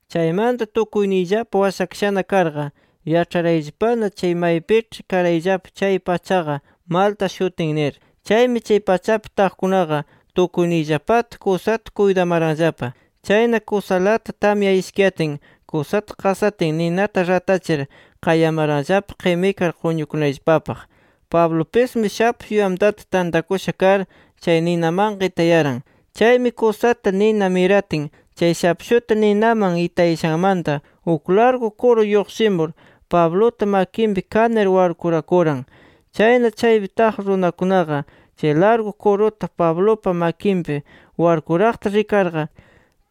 Chaymanta tukuyniyllapa washakashana karqa, yaĉharayllapana chay maypiĉhi karayllapa chay pachaqa Malta shutin nir. Chaymi chay pachapi taqkunaqa, tukuyniyllapata kusata kuytamaranllapa. Chayna kusalata tamya ishkiyatin kusata qasatin, ninata ratachir qayamaranllapa qimikar quñukunayllapapaq. Pablupismi shapshu yamtata tantakusha kar, chay ninamanqa itayaran. Chaymi, kusata nina miratin chay shapshuta ninaman itayashanmanta uk largu kuru lluqshimur Pabluta makinpi kanir warkurakuran. Chayna, chaypi taq runakunaqa chay largu kuruta, Pablupa makinpi warkuraqta rikarqa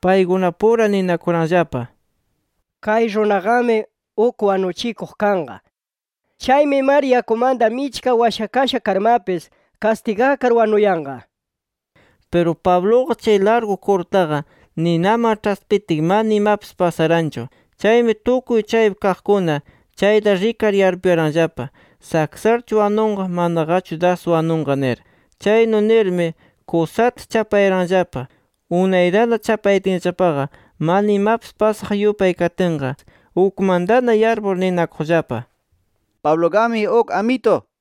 paykunapura ninakuranllapa: “Kay runaqami uk wanuchikuq kanqa. Chaymi mar yakumanta michka washakasha karmapis, kastigakar wanuyanqa” nir. Piru Pabluqa chay largu kurutaqa ninaman ĉhaspitin mana imapis pasaranchu. Chaymi tukuy chaypi kaqkuna chayta rikar yarpuyaranllapa: Saksarchu wanunqa, manaqachu das wanunqa nir. Chaynu nirmi kusata chapayaranllapa. Unaytana chapayatinllapaqa mana imapis pasaq yupay katinqa, ukmantana yarpur ninakuqllapa: “Pabluqami uk amitu” nir.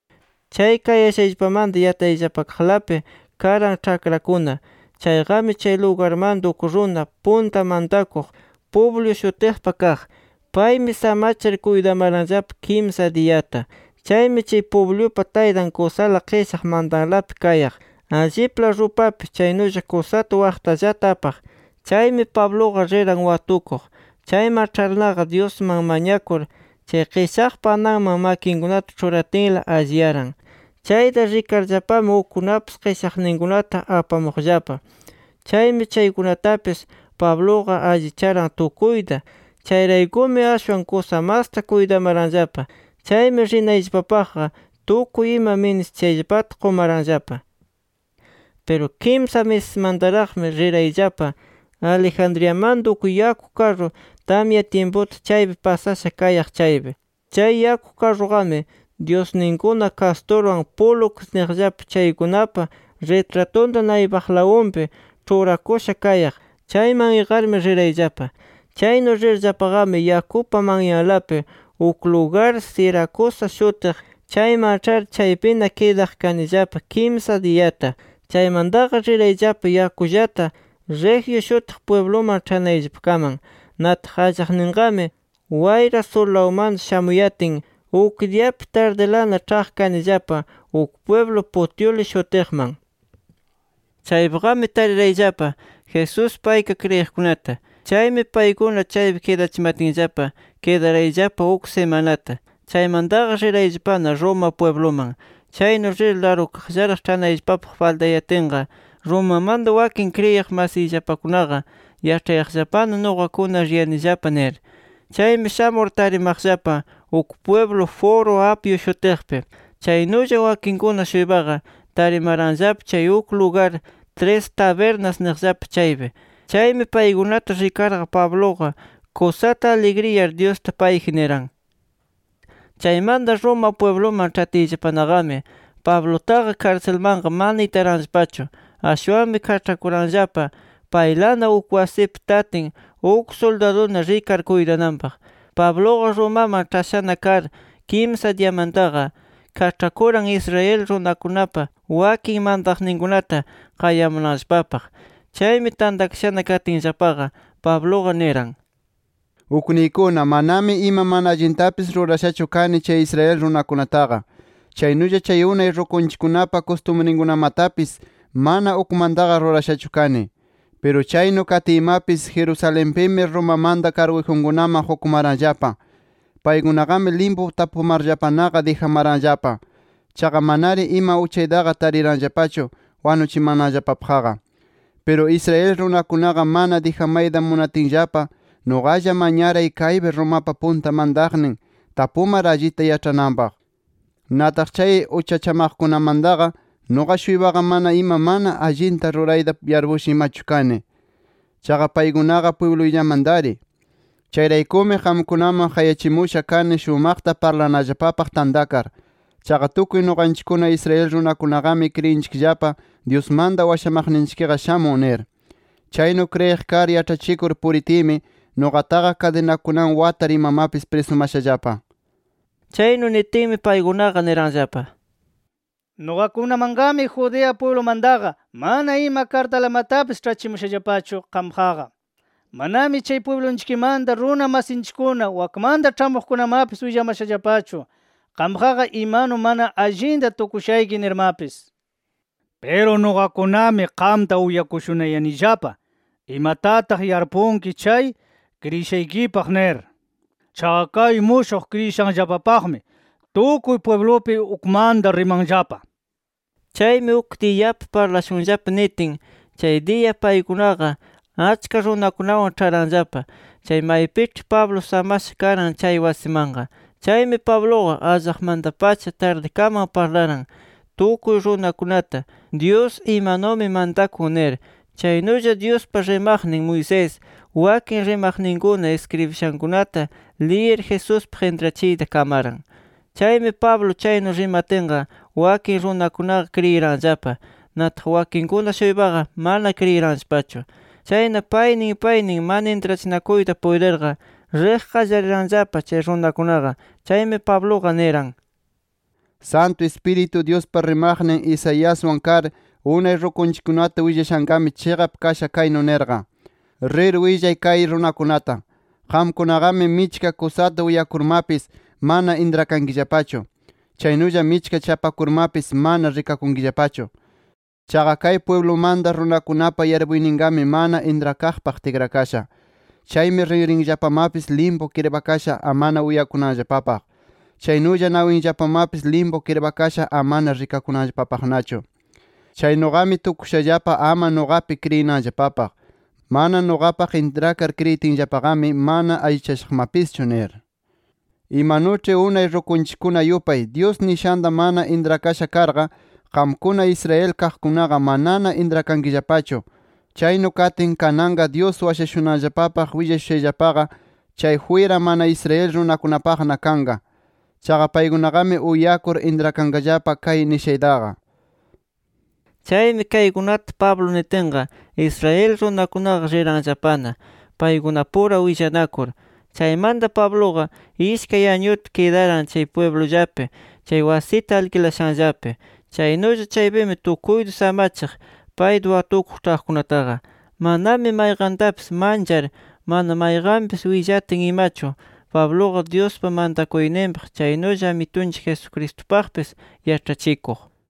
Chay kayashayllapamanta yatayllapakaqlapi karan ĉhakrakuna. Chayqami chay lugarmanta uk runa punta mantakuq Publio shutiqpa kaq. Paymi samachir kuytamaranllapa kimsa diyata. Chaymi chay Publiupa taytan kusala qishaq mantalapi kayaq. Allipla rupapi chaynulla kusata waqtallata apaq. Chaymi Pabluqa riran watukuq. Chayman ĉharnaqa, Dyusman mañakur chay qishaqpa ananman makinkunata ĉhuratinla, alliyaran. Chayta rikarllapami, ukkunapis qishaqninkunata apamuqllapa. Chaymi chaykunatapis Pabluqa allicharan tukuyta. Chayraykumi, ashwan kusa masta kuytamaranllapa. Chaymi rinayllapapaqqa tukuy ima ministishayllapata qumaranllapa. Piru kimsa misismantaraqmi rirayllapa, Alejandriamanta uk yaku karru tamya tyimputa chaypi pasasha kayaq chaypi. Chay yaku karruqami dyusninkuna Castorwan Pólux niqllapa chaykunapa ritratunta naypaqlawunpi ĉhurakusha kayaq. Chayman iqarmi rirayllapa. Chaynu rirllapaqami, yakupa manyanlapi uk lugar Siracusa shutiq chayman ĉhar, chaypina kidaq kanillapa kimsa diyata. Chaymantaqa rirayllapa yakullata, Regio shutiq pwibluman ĉhanayllapakaman. Nataq allaqninqami, wayra surlawmanta shamuyatin, uk diyapi tardilana ĉhaq kanillapa uk pwiblu Puteoli shutiqman. Chaypiqami tarirayllapa, Jesuspi ayka kriyiqkunata. Chaymi paykuna chaypi kidachimatinllapa kidarayllapa uk simanata. Chaymantaqa rirayllapana Roma pwibluman. Chaynu rir largullaraq ĉhanayllapapaq faltayatinqa Romamanta wakin kriyiq masiyllapakunaqa yaĉhayaqllapana nuqakuna riyanillapa nir. Chaymi shamur tarimaqllapa uk pwiblu Foro Apio shutiqpi. Chaynulla wakinkuna-shuypaqa tarimaranllapa chay uk lugar “Tres Tabernas” niqllapa chaypi. Chaymi paykunata rikarqa, Pabluqa kusata aligriyar Dyusta payji niran. Chaymanta Roma pwibluman ĉhatiyllapanaqami Pablutaqa karsilmanqa mana itaranllapachu. Ashwanmi kaĉhakuranllapa paylana uk wasipi tatin uk suldaduna rikar kuytananpaq. Pabluqa Romaman ĉhashana kar kimsa diyamantaqa, kaĉhakuran Israel runakunapa wakin mantaqninkunata qayamunanllapapaq. Chaymi tantakashana katinllapaqa, Pabluqa niran: —Ukniykuna manami ima mana allintapis rurashachu kani chay Israel runakunataqa. Chaynulla chay unay rukunchikkunapa kustumrinkunamatapis mana ukmantaqa rurashachu kani. Piru chaynu katiymapis, Jerusalenpimi, Romamanta karguyjunkunaman qukumaranllapa. Paykunaqami limpu tapumarllapanaqa dijamanaranllapa. Chaqa manari ima uchaytaqa tariranllapachu wanuchimananllapapaqqa. Piru Israel runakunaqa mana dijamayta munatinllapa, nuqalla mañaray kaypi Romapa punta mantaqnin tapumar allita yaĉhananpaq. Nataq chay uchachamaqkunamataqa, nuqa-shuypaqa mana ima mana allinta rurayta yarpusha imachu kani. Chaqa paykunaqa pwibluyllamantari. Chayraykumi qamkunaman qayachimusha kani shumaqta parlanallapapaq tantakar. Chaqa tukuy nuqanchikkuna Israel runakunaqami kriyinchikllapa Dyusmanta washamaqninchikqa shamun nir. Chaynu kriyiq kar yaĉhachikur puritiymi, nuqataqa kadinakunawan watar imamapis prisumashallapa. Chaynu nitinmi paykunaqa niranllapa: —Nuqakunamanqami, Judea pwiblumantaqa mana ima kartalamatapis ĉhachimushallapachu qampaqqa. Manami chay pwiblunchikmanta runa masinchikkuna wakmanta ĉhamuqkunamapis willamashallapachu qampaqqa imanu mana allinta tukushayki nirmapis. Piru nuqakunami qamta uyakushunayanillapa imatataq yarpunki chay kriyishaykipaq nir. Chaqa kay mushuq kriyishanllapapaqmi, tukuy pwiblupi ukmanta rimanllapa. Chaymi uk diyapi parlashunllapa nitin, chay diya paykunaqa achka runakunawan ĉharanllapa chay maypiĉhi Pablo samasha karan chay wasimanqa. Chaymi Pabluqa allaqmanta-pacha tardikaman parlaran tukuy runakunata, Dyus imanumi mantakun nir. Chaynulla Dyuspa rimaqnin Moisés, wakin rimaqninkuna iskribishankunata liyir Jesuspaq intrachiyta kamaran. Chaymi Pablo chaynu rimatinqa, wakin runakunaqa kriyiranllapa. Nataq wakinkuna-shuypaqa mana kriyiranllapachu. Chayna paynin paynin mana intrachinakuyta puytirqa, riq qallariranllapa chay runakunaqa. Chaymi Pabluqa niran: —Santu Ispiritu Dyuspa rimaqnin Isaiaswan kar unay rukunchikkunata willashanqami chiqap kasha kaynu nirqa: ‘Rir willay kay runakunata: Qamkunaqami michka kusata uyakurmapis, mana intrakankillapachu. Chaynulla michka chapakurmapis, mana rikakunkillapachu. Chaqa kay pwiblumanta runakunapa yarpuyninqami mana intrakaqpaq tikrakasha. Chaymi rinrinllapamapis limpu kirpakasha amana uyakunanllapapaq. Chaynulla nawinllapamapis limpu kirpakasha amana rikakunanllapapaqnachu. Chaynuqami tukushallapa ama nuqapi kriyinanllapapaq. Mana nuqapaq intrakar kriyitinllapaqami, mana allichashaqmapischu nir’. Imanuĉhi unay rukunchikkuna yupay, Dyus nishanta mana intrakasha karqa, qamkuna Israel kaqkunaqa manana intrakankillapachu. Chaynu katin kananqa Dyus washashunanllapapaq willashushayllapaqa chay jwira mana Israel runakunapaqna kanqa. Chaqa paykunaqami uyakur intrakanqallapa kay nishaytaqa. [ Chaymi kaykunata Pablo nitinqa, Israel runakunaqa riranllapana paykunapura willanakur.] Chaymanta Pabluqa, ishkay añuta kidaran chay pwiblullapi chay wasita alkilashanllapi. Chaynulla chaypimi tukuyta samachiq payta watukuq ĉhaqkunataqa. Manami mayqantapis manchar, mana mayqanpis willatin imachu, Pabluqa Dyuspa mantakuyninpaq, chaynulla Amitunchik Jesucristupaqpis yaĉhachikuq.